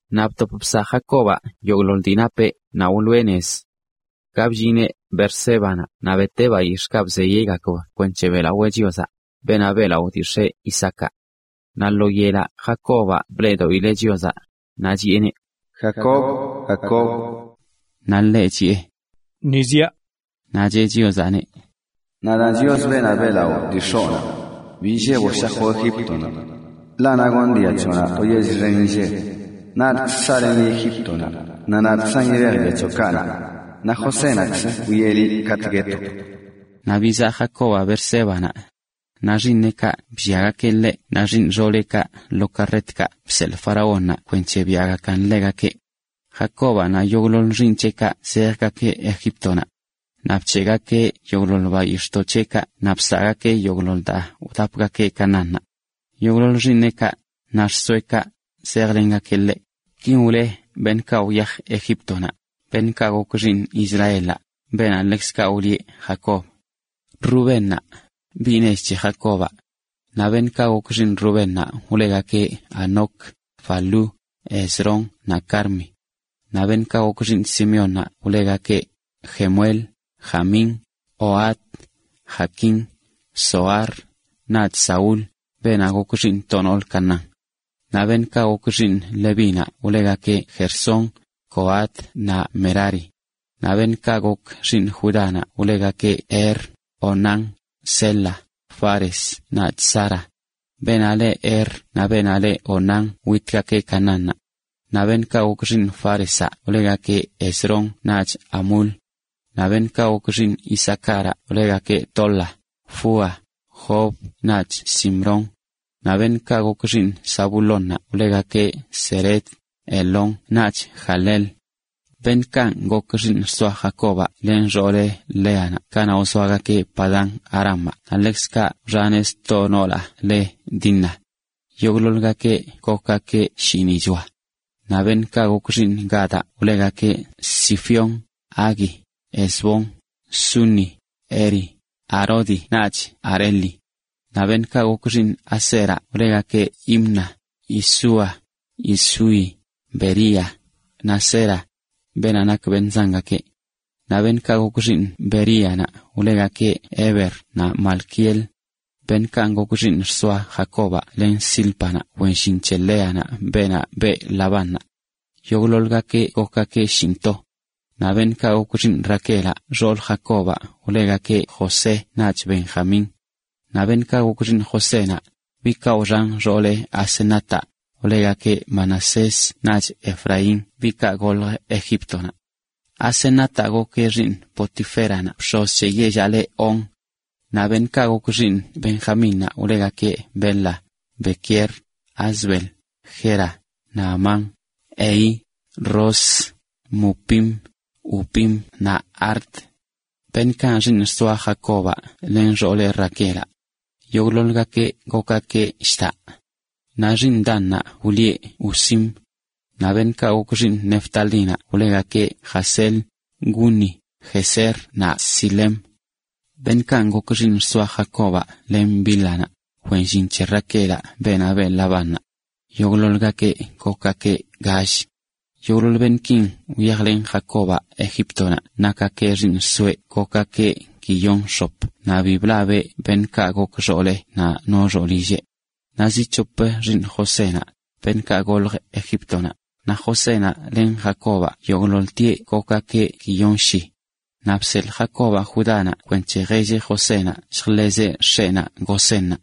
Naꞌ btop bsaꞌ Jacobaꞌ yogꞌḻoḻ dii napeꞌ naꞌ wloꞌe nez. Ka bllineꞌ Beersébanaꞌ naꞌ beteꞌ bayix̱ꞌkaꞌ bzeyeꞌgakb kwenc̱he beꞌlawee Chiozaꞌ, beenaꞌ beꞌlaꞌo dii x̱eꞌ Isaacaꞌ. Naꞌ lo yelaꞌ Jacobaꞌ bleꞌdoꞌileꞌ Chiozaꞌ, naꞌ chiꞌeneꞌ: ―Jacob, Jacob. Naꞌ ḻeꞌ chiꞌe: ―Ni ziaꞌ. Naꞌ cheꞌ Chiozaꞌneꞌ: ―Nadaan Chios, beenaꞌ beꞌlaꞌo dii x̱oꞌnaꞌ. Bi illeboꞌ shajoꞌ Egíptonaꞌ, ḻaꞌ naꞌ gonꞌ dia c̱hoꞌnaꞌ to yell xen inlleb. Nadꞌkzə saꞌlenꞌ liꞌ Egíptonaꞌ, naꞌ nadꞌkzan yibej dia c̱hoꞌkaꞌ naꞌ. Naꞌ Josénaꞌkzə wwieꞌ liꞌ katꞌ guetoꞌ. Naꞌ bizaꞌ Jacobaꞌ Beersébanaꞌ. Naꞌ xiiṉeꞌkaꞌ blliagakeꞌ ḻeꞌ naꞌ xiiṉ xooleꞌkaꞌ ḻoo karretkaꞌ bseḻꞌ faraónnaꞌ kwenc̱he biaꞌgakan ḻegakeꞌ. Jacobaꞌ naꞌ yogꞌḻoḻ xiiṉ c̱heꞌkaꞌ zejgakeꞌ Egíptonaꞌ. Naꞌ bc̱heꞌgakeꞌ yogꞌḻoḻ bayix̱ꞌdoꞌ c̱heꞌkaꞌ naꞌ bsaagakeꞌ yogꞌḻoḻ daa wdapgakeꞌ Canaánnaꞌ. Yogꞌḻoḻ xiiṉeꞌkaꞌ, naꞌ xsoeꞌkaꞌ, zejlengakeꞌ ḻeꞌ. Kin wle beṉꞌkaꞌ wyaj Egíptonaꞌ, beṉꞌkaꞌ gok xiiṉ Israelaꞌ, beenaꞌ ḻekzkaꞌ wlieꞌ Jacob: Rubénnaꞌ, biꞌ nech c̱he Jacobaꞌ. Naꞌ beṉꞌkaꞌ gok xiiṉ Rubénnaꞌ wlegakeꞌ Hanoc, Falú, Hezrón naꞌ Carmi. Naꞌ beṉꞌkaꞌ gok xiiṉ Simeónnaꞌ wlegakeꞌ Jemuel, Jamín, Ohad, Jaquín, Zohar naꞌch Saúl, beenaꞌ gok xiiṉ to noolə Canaán. Naꞌ beṉꞌkaꞌ gok xiiṉ Levínaꞌ wlegakeꞌ Gersón, Coat naꞌ Merari. Naꞌ beṉꞌkaꞌ gok xiiṉ Judánaꞌ wlegakeꞌ Er, Onán, Sela, Fares naꞌch Zara. Beenaꞌ leꞌ Er naꞌ beenaꞌ leꞌ Onán witgakeꞌ Canaánnaꞌ. Naꞌ beṉꞌkaꞌ gok xiiṉ Fárezaꞌ wlegakeꞌ Hezrón naꞌch Hamul. Naꞌ beṉꞌkaꞌ gok xiiṉ Isacáraꞌ wlegakeꞌ Tola, Fúa, Job naꞌch Simrón. Naꞌ beṉꞌkaꞌ gok xiiṉ Zabulónnaꞌ wlegakeꞌ Sered, Elón naꞌch Jahleel. Beṉꞌkanꞌ gok xiiṉ xsoa Jacobaꞌ len xooleꞌ Léanaꞌ kanaꞌ wzoagakeꞌ Padán-arámaꞌ naꞌ ḻekzkaꞌ wxaneꞌ sto noolaꞌ le Dina. Yogꞌḻoḻgakeꞌ gokgakeꞌ shiiṉichoa. Naꞌ beṉꞌkaꞌ gok xiiṉ Gadaꞌ wlegakeꞌ Zifión, Hagui, Ezbón, Suni, Eri, Arodi naꞌch Areli. Naꞌ beṉꞌkaꞌ gok xiiṉ Aseraꞌ wlegakeꞌ Imna, Isúa, Isúi, Bería, naꞌ Sera, beenaꞌ nak beṉꞌ zangakeꞌ. Naꞌ beṉꞌkaꞌ gok xiiṉ Beríanaꞌ wlegakeꞌ Heber naꞌ Malquiel. Beṉꞌkanꞌ gok xiiṉ xsoa Jacobaꞌ len Zílpanaꞌ wen llin c̱he Léanaꞌ beenaꞌ beꞌ Labánnaꞌ. Yogꞌḻoḻgakeꞌ gokgakeꞌ shinꞌto. Naꞌ beṉꞌkaꞌ gok xiiṉ Raquelaꞌ xoolə Jacobaꞌ wlegakeꞌ José naꞌch Benjamín. Naꞌ beṉꞌkaꞌ gok xiiṉ Josénaꞌ, biꞌkaꞌ wxan xooleꞌ Asenataꞌ, wlegakeꞌ Manasés naꞌch Efraín biꞌkaꞌ goljə Egíptonaꞌ. Asenataꞌ gokeꞌ xiiṉ Potiféranaꞌ bx̱oz c̱he yellaꞌ le On. Naꞌ beṉꞌkaꞌ gok xiiṉ Benjamínnaꞌ wlegakeꞌ Bela, Bequer, Asbel, Gera, Naamán, Ehi, Ros, Mupim, Hupim naꞌ Ard. Beṉꞌkanꞌ xiiṉ xsoa Jacobaꞌ len xooleꞌ Raquelaꞌ. Yogꞌḻoḻgakeꞌ gokgakeꞌ lldaꞌ. Naꞌ xiiṉ Dannaꞌ wlieꞌ Husim. Naꞌ beṉꞌkaꞌ gok xiiṉ Neftalínaꞌ wlegakeꞌ Jahzeel, Guni, Jezer naꞌ Silem. Beṉꞌkanꞌ gok xiiṉ xsoa Jacobaꞌ len Bílhanaꞌ, wen llin c̱he Raquelaꞌ beenaꞌ beꞌ Labánnaꞌ. Yogꞌḻoḻgakeꞌ gokgakeꞌ gall. Yogꞌḻoḻ beṉꞌkin wyajlen Jacobaꞌ Egíptonaꞌ nakgakeꞌ xiiṉ xsoeꞌ gokgakeꞌ guiyon x̱op naꞌ bi blabeꞌ beṉꞌkaꞌ gok xooleꞌ naꞌ no xoolilleꞌ. Naꞌ zi c̱hop xiiṉ Josénaꞌ, beṉꞌkaꞌ goljə Egíptonaꞌ, naꞌ Josénaꞌ len Jacobaꞌ, yogꞌḻoḻtieꞌ gokgakeꞌ guiyon shi. Naꞌ bseḻꞌ Jacobaꞌ Judánaꞌ kwenc̱he jelleꞌ Josénaꞌ lljḻezeꞌ x̱eꞌnaꞌ Gosénnaꞌ.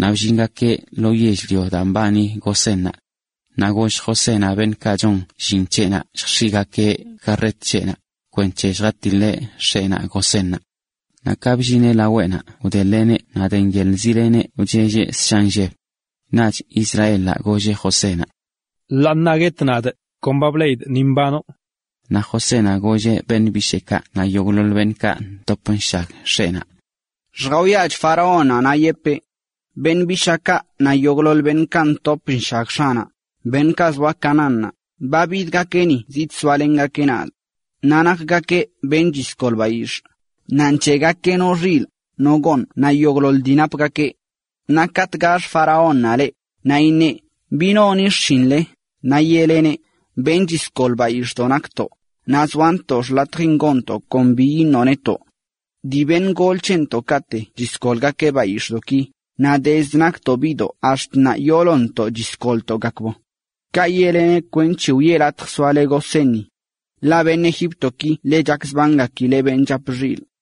Naꞌ bllingakeꞌ lo yell-lio daan mbani Gosénnaꞌ. Naꞌ goll Josénaꞌ beṉꞌkaꞌ chon llin c̱heꞌnaꞌ lljx̱iꞌgakeꞌ karret c̱heꞌnaꞌ, kwenc̱he lljatiḻeꞌ x̱eꞌnaꞌ Gosénnaꞌ. Naꞌ ka bllineꞌ laweꞌnaꞌ wdeḻeꞌneꞌ naꞌ de nyeḻꞌzileꞌneꞌ wchelleꞌ ssha nlleb. Naꞌch Israelaꞌ golleꞌ Josénaꞌ: ―Ḻaa ṉaa guetꞌ nadꞌ, kon ba bleꞌidꞌ ni mbanoꞌ. Naꞌ Josénaꞌ golleꞌ beṉꞌ bisheekaꞌ naꞌ yogꞌḻoḻ beṉꞌkaꞌ ntop nshag x̱eꞌnaꞌ: ―Lljawiachꞌ faraónnaꞌ naꞌ yepee: “Beṉꞌ bishaakaꞌ naꞌ yogꞌḻoḻ beṉꞌkaꞌ ntop nshag x̱aꞌnaꞌ, beṉꞌkaꞌ zoa Canaánnaꞌ, ba bidgakeꞌ ni, zidsoalengakeꞌ nadꞌ. Naꞌ nakgakeꞌ beṉꞌ chisgol bayix̱ꞌ; naꞌ nc̱heꞌgakeꞌ no xilꞌ, no gooṉ naꞌ yogꞌḻoḻ dii napgakeꞌ.” Naꞌ katꞌ gax faraónnaꞌ leꞌ, naꞌ iṉeꞌ: “¿Bi noni xshinle?,” naꞌ yeꞌleneꞌ: “Beṉꞌ chisgol bayix̱ꞌdoꞌ nakntoꞌ, naꞌ zoantoꞌ xḻatjin gonntoꞌ kon bi iṉoꞌ netoꞌ. Dii beṉꞌ gol c̱hentoꞌkaꞌte chisgolgakeꞌ bayix̱ꞌdoꞌki, naꞌ dezd naktentoꞌ biꞌdoꞌ ax̱t ṉaa yoolontoꞌ chisgolntoꞌgakb.” Kaꞌ yeꞌleneꞌ kwenc̱he wiꞌe latj soale Gosénni. Ḻaꞌ beṉꞌ Egíptoki ḻe chakzbangakileꞌ beṉꞌ chap xilꞌ.